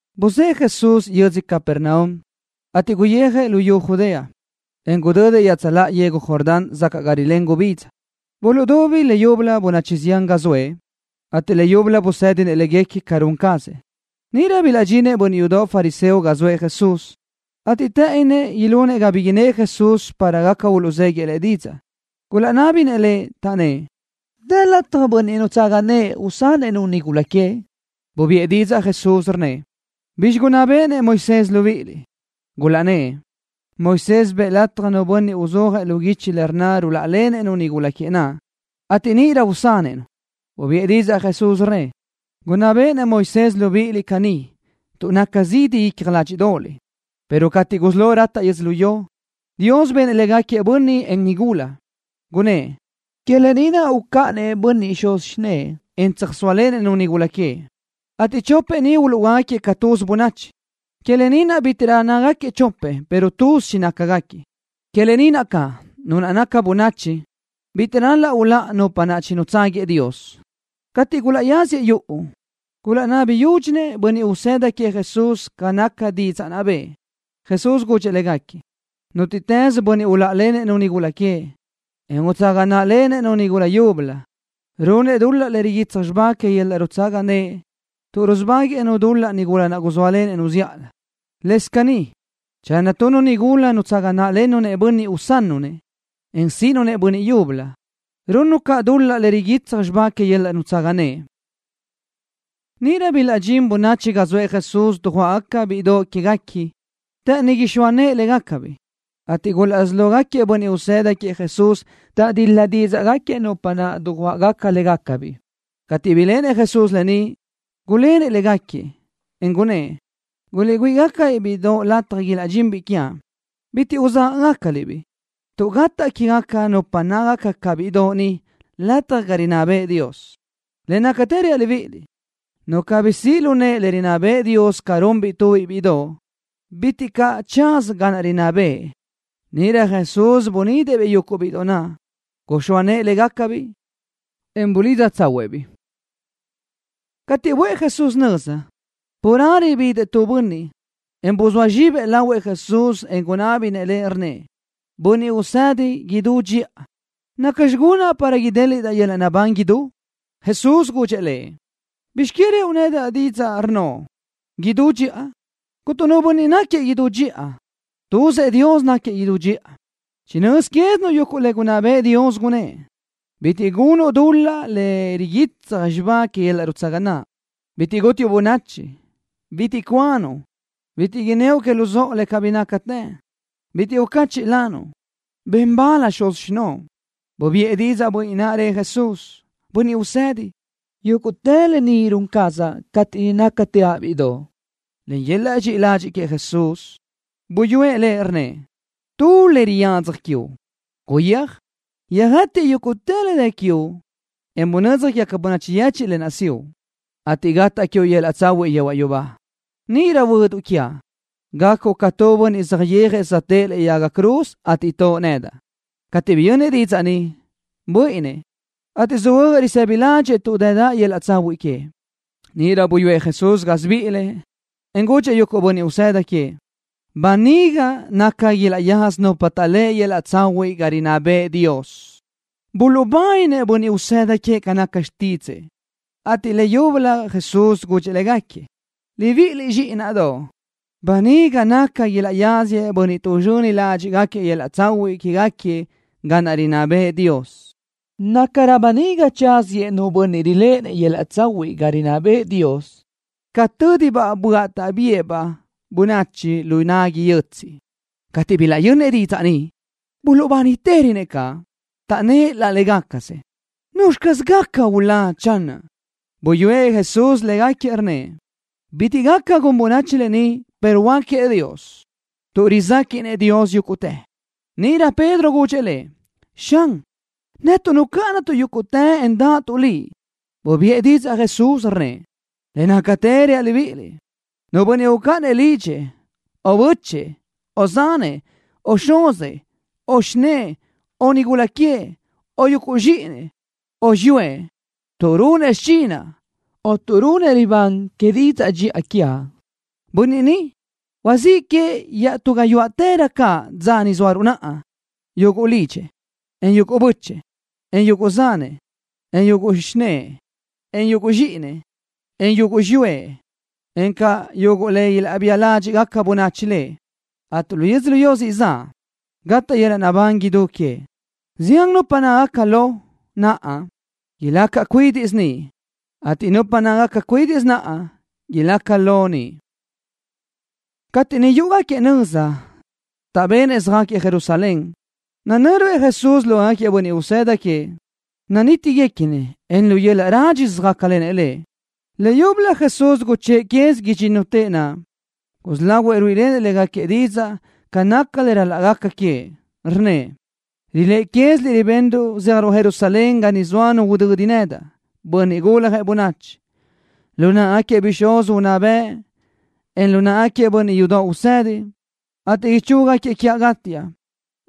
Buzë́ʼë Jesús yödzö Capernaum, ateʼ guyijëʼ luyú Judea, en gudödëʼ iaʼtsöláʼa yegu Jordán sacaʼ ga rilén gubidza. Buluʼdubi leyúbölö bönachi zián ga zoëʼ, ateʼ leyúbölö busë́dinëʼ légaquiëʼ ca run cazëʼ. Níʼirö bilaʼdxinëʼ bönniʼ yudoʼ fariseo ga zoëʼ Jesús, ateʼ të́ʼënnëʼ ilunëʼ ga bi innë́ʼ Jesús para gaca uluʼzéguiëʼ Lëʼ didzaʼ. Gulaʼnábinëʼ Lëʼ, taʼnnë́ʼ: —¿Dë lataj bönniʼ nutsaga nëʼë usanëʼ-nu nigula queëʼ? Bubiʼë didzaʼ Jesús, rnnëʼ: —¿Bizxi gunná béʼenëʼ Moisés libíʼiliʼ? Gulaʼnnë́ʼ: —Moisés bëʼë lataj nu bönniʼ uzúajëʼ lu guichi le rnna ruláʼalenëʼ-nu nigula queëʼ naʼ, ateʼ níʼirö usanëʼ-nu. Bubiʼë didzaʼ Jesús, rnnëʼ: —Gunná béʼenëʼ Moisés libíʼiliʼ caní tuʼ naca zidi icja ládxiʼdoʼoliʼ, pero cateʼ gusí lo rataʼ yödzölió, Dios benëʼ légaquiëʼ bönniʼ, en nigula. Gunnë́ʼ: “Que lë ni naʼ ucáʼanëʼ bönniʼ xuz xinë́ʼë, en tsöjsóalenëʼ-nu nigula queëʼ, ateʼ chopëʼ ni uluʼhuöáquiëʼ ca tuz bönachi.” Que lë ni naʼ bítiʼrö nácagaquiëʼ chopëʼ pero tuz chinácagaquiëʼ. Que lë ni naʼ caʼ, nu naca bönachi bitiʼ ral-laʼ uláʼa nupa naʼ chinutságuiëʼ Dios. Cateʼ gulaʼyáziëʼ yuʼu, gulaʼnabi yúdxinëʼ bönniʼ usëda queëʼ Jesús ca naca didzaʼ naʼ bëʼë. Jesús gudxëʼ légaquiëʼ: —Nútiʼtës bönniʼ uláʼalenëʼ-nu nigula queëʼ, en utsaga náʼalenëʼ-nu nigula yúbölö, runëʼ dul-laʼ le riguitsaj xibá que yöl-laʼ nutsaga naʼ tuʼ rusubáguëʼë-nu dul-laʼ nigula naʼ guzóalenëʼ-nu zíʼalö. Lëscaʼ caní channö tu nigula nutsaga náʼlennu bönniʼ usannu-nëʼ, en síʼinu-nëʼ bönniʼ yúbölö, runnu caʼ dul-laʼ le riguitsaj xibá que yöl-laʼ nutsaga naʼ. Níʼirö bilaʼdxín bönachi ga zoëʼ Jesús dujuáʼgaquiëʼ bíʼidoʼ quéguequi. Të́ʼëni ixóa nëʼë légacabiʼ, ateʼ gulaʼsí lógaquiëʼ bönniʼ usëda queëʼ Jesús taʼdil-la dídzaʼgaquiëʼ nupa naʼ dujuáʼagaca légacabiʼ. Cateʼ biléʼenëʼ Jesús lë ni, gulénëʼ légaquiëʼ, en gunnë́ʼ: —Guliʼgüíʼ-gácabiʼ bíʼidoʼ lataj ilaʼdxinbiʼ quiaʼ. Bitiʼ uzágaʼgacaliʼ-biʼ, tuʼ gataʼ quégaca nupa nácagaca ca bíʼidoʼ ni, lataj ga rinná bëʼë Dios. Le nácatë reaʼ libíʼiliʼ: Nu cabí siʼ lu nëʼe le rinná bëʼë Dios ca runbiʼ tu bíʼidoʼ, bitiʼ caʼ tsaza ga niʼ rinná bëʼë. Níʼirö Jesús bunidëʼ-biʼ yuguʼ bíʼidoʼ naʼ. Guxóa nëʼë légacabiʼ, en bulidza tsáhuëʼë-biʼ. Cateʼ buʼë Jesús nöza, carelö bidëʼ tu bönniʼ, en buzóa zxibëʼ lahuëʼ Jesús, en gunábinëʼ Lëʼ, rnnëʼ: —Bönniʼ Usedi idú dxiʼa, ¿nacxi gunaʼ para idéliʼdaʼ yöl-laʼ naʼbán idú? Jesús gudxëʼ lëʼ: —¿Bizx que ruʼu nedaʼ didzaʼ, rnnoʼ: “Idú dxiʼa”? Cuntu nu bönniʼ náquiëʼ idú dxiʼa. Tuzëʼ Dios náquiëʼ idú dxiʼa. Chinö́z quézinuʼ yuguʼ le gunná bëʼë Dios, gunnë́ʼ: Bitiʼ gunuʼ dul-laʼ le riguitsaj xibá que yöl-laʼ nutsaga naʼ. Bitiʼ gútiuʼ bönachi. Bitiʼ cuanuʼ. Bitiʼ inníoʼ que luzóʼo le cabí nácatë. Bitiʼ ucáchiʼlanuʼ. Ben bal xuz xinóʼo. Bubiʼë didzaʼ bönniʼ naʼ, rëʼ Jesús: —Bönniʼ Usedi, yúguʼtë lë ni run cazaʼ cateʼ niʼ nácateaʼ bíʼidoʼ. Len yöl-laʼ dxiʼi ladxiʼ queëʼ, Jesús buyúëʼ lëʼ, rnnëʼ: —Tu le riyadzaj quiuʼ. Guyéaj, yöjëtiʼ yúguʼtë le dë quiuʼ, en bunödzaj quégaca bönachi yechiʼ lë naʼ siʼu, ateʼ gataʼ quiuʼ yöl-laʼ tsahuiʼ yehuaʼ yubá. Níʼirö huöduʼ quiaʼ, gacuʼ ca tu bönniʼ saʼyéajëʼ söjtë́ʼë lëʼe yaga cruz, ateʼ toʼo nedaʼ. Cateʼ biyönnëʼ didzaʼ ni, buíʼinnëʼ, ateʼ söhuö́jëʼ risëbi ládxëʼë tuʼ dëdaʼ yöl-laʼ tsahuiʼ queëʼ. Níʼirö buyúëʼ Jesús gásibiʼilëʼ, en gudxëʼ yuguʼ bönniʼ usëda queëʼ: —Böniga naca ilaʼyaza nupa taʼléʼe yöl-laʼ tsahuiʼ ga rinná bëʼë Dios. Buluʼbáninëʼ bönniʼ usëda queëʼ ca naca xtídzëʼë, ateʼ leyúbölö Jesús gudxëʼ légaquiëʼ: —Libiʼiliʼ, zxíʼinaʼdoʼ, böniga naca ilaʼyáziëʼ bönniʼ tuʼzxöni ládxiʼgaquiëʼ yöl-laʼ tsahuiʼ quégaquiëʼ ga rinná bëʼë Dios. Nácarö böniga tsáziëʼ nu bönniʼ riléʼenëʼ yöl-laʼ tsahuiʼ ga rinná bëʼë Dios, ca tö́dibaʼ böaʼ taʼbía-baʼ bönachi lu nagui yötsiʼ. Cateʼ bilaʼyönnëʼ didzaʼ ni, buluʼbánitërönëʼ caʼ. Taʼnnë́ʼ laʼ légacasëʼ: —¿Nuzxi caz gaca ulá, channö? Buyúëʼ Jesús légaquiëʼ, rnnëʼ: —Bitiʼ gaca gun bönachi lë ni, pero huáquiëʼ Dios, tuʼ rizéquiʼnëʼ Dios yúguʼtë. Níʼirö Pedro gudxëʼ Lëʼ: —Xan, netuʼ nucáʼanatuʼ yúguʼtë, en dáʼatuʼ Liʼ. Bubiʼë didzaʼ Jesús, rnnëʼ: —Le nácatë reaʼ libíʼiliʼ, nu bönniʼ ucáʼanëʼ lidxëʼ, o bö́chëʼë, o zanëʼ, o xuzëʼ, o xinë́ʼë, o nigula queëʼ, o yuguʼ zxíʼinëʼ, o xiyúëʼ, tuʼ runëʼ xichinaʼ o tuʼ runëʼ libán que didzaʼ dxiʼa quiaʼ, bönniʼ ni huazíʼ queëʼ iaʼtú gayuáʼtërö caʼ dza ni zóaruʼ naʼa, yuguʼ lidxëʼ, en yuguʼ bö́chëʼë, en yuguʼ zanëʼ, en yuguʼ xinë́ʼë, en yuguʼ zxíʼinëʼ, en yuguʼ xiyúëʼ, encaʼ yuguʼ le ilaʼbía ládxiʼgaca bönachi lëʼ, ateʼ lu yödzölió siʼ zaʼ, gataʼ yöl-laʼ naʼbán idú queëʼ. Zián nupa nácagaca lo naʼa, ilaca cuídiʼsö niʼ, ateʼ nupa nácagaca cuídiʼsö naʼa, ilaca lo niʼ. Cateʼ niʼ yúʼugaquiëʼ nöza, taʼbenëʼ söjáquiëʼ Jerusalén, nanö́ruëʼ Jesús lógaquiëʼ bönniʼ usëda queëʼ. Nanítiguequinëʼ, en lu yöl-laʼ rádxisö söjácalenëʼ Lëʼ. Leyúbölö Jesús guchë́ʼë quez idxínnutëʼ naʼ. Gusí lahuëʼ ruíʼilenëʼ légaquiëʼ didzaʼ ca naca le ral-laʼ gaca queëʼ. Rnnëʼ: —Riléʼe quéziliʼ ribenruʼ zéajruʼ Jerusalén ga niʼ zoa nu udödi nedaʼ, Bönniʼ Guljëʼ Bönachi, lu náʼagaquiëʼ bixúz unná bëʼ, en lu náʼagaquiëʼ bönniʼ yudoʼ usedi, ateʼ chúguiëʼ quiaʼ gátiaʼ,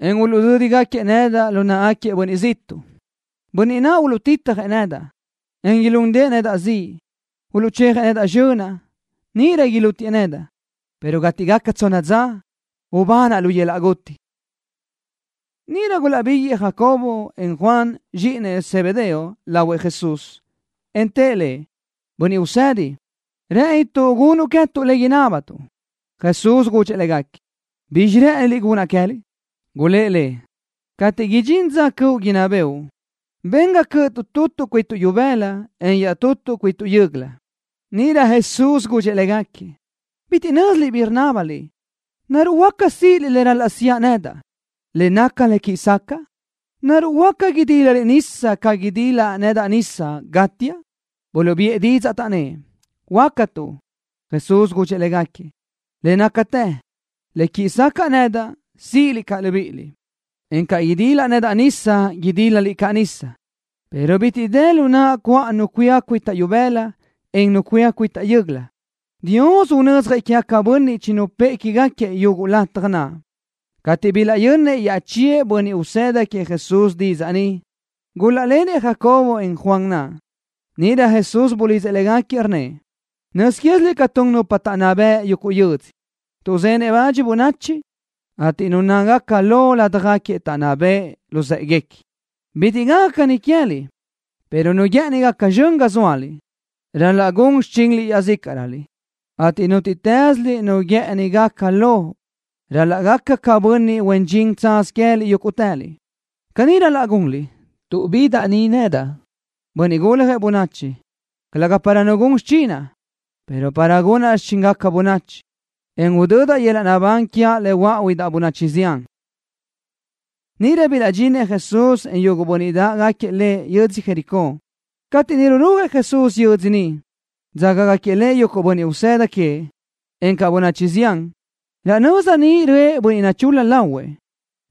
en uluʼdödëʼ nedaʼ lu náʼagaquiëʼ bönniʼ ziʼtuʼ. Bönniʼ naʼ uluʼtitjëʼ nedaʼ, en ilúndëʼë nedaʼ ziʼ. Uluʼchejëʼ nedaʼ zxönaʼ. Níʼirö ilútiëʼ nedaʼ, pero cateʼ gaca tsonna dza ubanaʼ lu yöl-laʼ guti. Níʼirö gulaʼbiguëʼë Jacobo, en Juan, zxíʼinëʼ Zebedeo, lahuëʼ Jesús, en tëʼ Lëʼ: —Bönniʼ Usedi, rë́ʼënituʼ gunuʼ queë́tuʼ le inábatuʼ. Jesús gudxëʼ légaquiëʼ: —¿Bizxi rë́ʼëniliʼ gunaʼ queë́liʼ? Gulë́ʼ Lëʼ: —Cateʼ idxín dza cöʼu ga inná bëʼu, ben ga cö́ʼötuʼ tutuʼ cuituʼ ibëla, en iaʼtutuʼ cuituʼ yö́göla. Níʼirö Jesús gudxëʼ légaquiëʼ: —Bitiʼ nö́ziliʼ bi rinábaliʼ. ¿Naruʼ huáca síʼiliʼ le ral-laʼ siʼa nedaʼ, le naca le quiʼi sacaʼa? ¿Naruʼ huáca idílaliʼ nisa ca idilaʼ nedaʼ nisa, gátiaʼ? Buluʼbiʼë didzaʼ, taʼnnë́ʼ: —Huácatuʼ. Jesús gudxëʼ légaquiëʼ: —Le nácatë, le quiʼi sacaʼa nedaʼ, síʼiliʼ caʼ libíʼiliʼ, en ca idilaʼ nedaʼ nisa, idílaliʼ caʼ nisa, pero bitiʼ dë lu naʼa cö́aʼ nu cuía cuitaʼ ibëla, en nu cuía cuitaʼ yö́göla. Dios unödzjëʼ quégaquiëʼ bönniʼ chinupë́ʼë quégaquiëʼ yuguʼ lataj naʼ. Cateʼ bilaʼyönnëʼ iaʼchíëʼ bönniʼ usëda queëʼ Jesús didzaʼ ni, gulaʼlenëʼ Jacobo, en Juan naʼ. Níʼirö Jesús bulidzëʼ légaquiëʼ, rnnëʼ: —Nöz quéziliʼ ca tun nupa taʼnná beʼe yuguʼ yödzö, tuʼzenëʼ bach bönachi, ateʼ nupa nácagaca lo ládjagaquiëʼ taʼnná beʼe luzë́ʼeguequi. Bitiʼ gaca caní queë́liʼ, pero nu guë́ʼëni gaca zxön ga zóaliʼ, ral-laʼ gun xichinliʼ iaʼzícaʼröliʼ, ateʼ nútiʼtëslöliʼ nu guë́ʼëni gaca lo ral-laʼ gaca ca bönniʼ huen dxin tsaz queë́liʼ yúguʼtëliʼ. Caní ral-laʼ gunliʼ tuʼ bidaʼ ni nedaʼ, Bönniʼ Guljëʼ Bönachi, calëga para nu gun xichinaʼ, pero para gunaʼ xichíngaca bönachi, en udödaʼ yöl-laʼ naʼbán quiaʼ le huöáʼuidaʼ bönachi zián. Níʼirö bilaʼdxinëʼ Jesús, en yuguʼ bönniʼ dáʼgaquiëʼ Lëʼ yödzö Jericó. Cateʼ niʼ rurujëʼ Jesús yödzö ni, dzágagaquiëʼ Lëʼ yuguʼ bönniʼ usëda queëʼ, encaʼ bönachi zián. Raʼ nöza niʼ röʼë tu bönniʼ nachul-la lahuëʼ,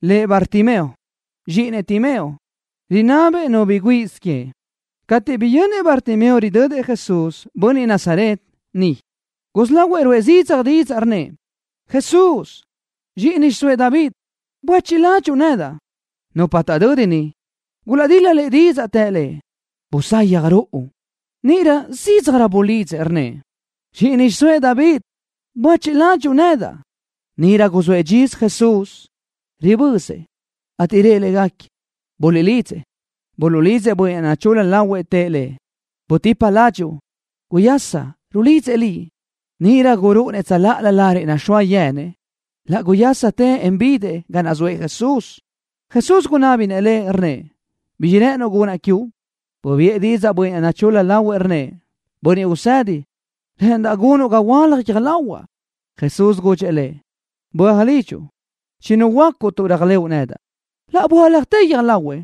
lëʼ Bartimeo, zxíʼinëʼ Timeo. Rinabëʼ nu bi gúnnasö queëʼ. Cateʼ biyönnëʼ Bartimeo ridödëʼ Jesús, bönniʼ Nazaret, niʼ, gusí lahuëʼ ruʼë zidzaj didzaʼ, rnnëʼ: —¡Jesús, zxíʼini xiʼsóëʼ David! ¡Buéchiʼ ladxiʼ nedaʼ! Nupa taʼdödi niʼ gulaʼdil-la lëʼ didzaʼ. Të lëʼ: —Busayaj ruʼu. Níʼirö zídzajrö bulidzëʼ, rnnëʼ: —¡Zxíʼini xiʼsóëʼ David! ¡Buéchiʼ ladxiʼ nedaʼ! Níʼirö guzóëʼ dxisö Jesús, ribözëʼ, ateʼ rëʼ légaquiëʼ: —Buliʼlidzëʼ. Buluʼlidzëʼ bönniʼ naʼ nachul-la lahuëʼ. Tëʼ lëʼ: —¡Butipa ládxuʼu! ¡Guyaschi! ¡Rulidzëʼ liʼ! Níʼirö gurúʼunëʼ tsöláʼalö lariʼ naxóa yenëʼ. Laʼ guyásatëʼ, en bidëʼ ga naʼ zoëʼ Jesús. Jesús gunábinëʼ lëʼ, rnnëʼ: —¿Bizxi rë́ʼënuʼ gunaʼ quiuʼ? Bubiʼë didzaʼ bönniʼ naʼ nachul-la lahuëʼ, rnnëʼ: —Bönniʼ Usedi, rë́ʼëndaʼ gunuʼ ga huöálaj guiö́j lahuaʼ. Jesús gudxëʼ lëʼ: —Böaj lidxuʼ. Chinuhuöácuʼ tuʼ réajlëʼu nedaʼ. Laʼ böáljatë guiö́j lahuëʼ,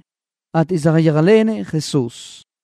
ateʼ saʼyéajlenëʼ Jesús.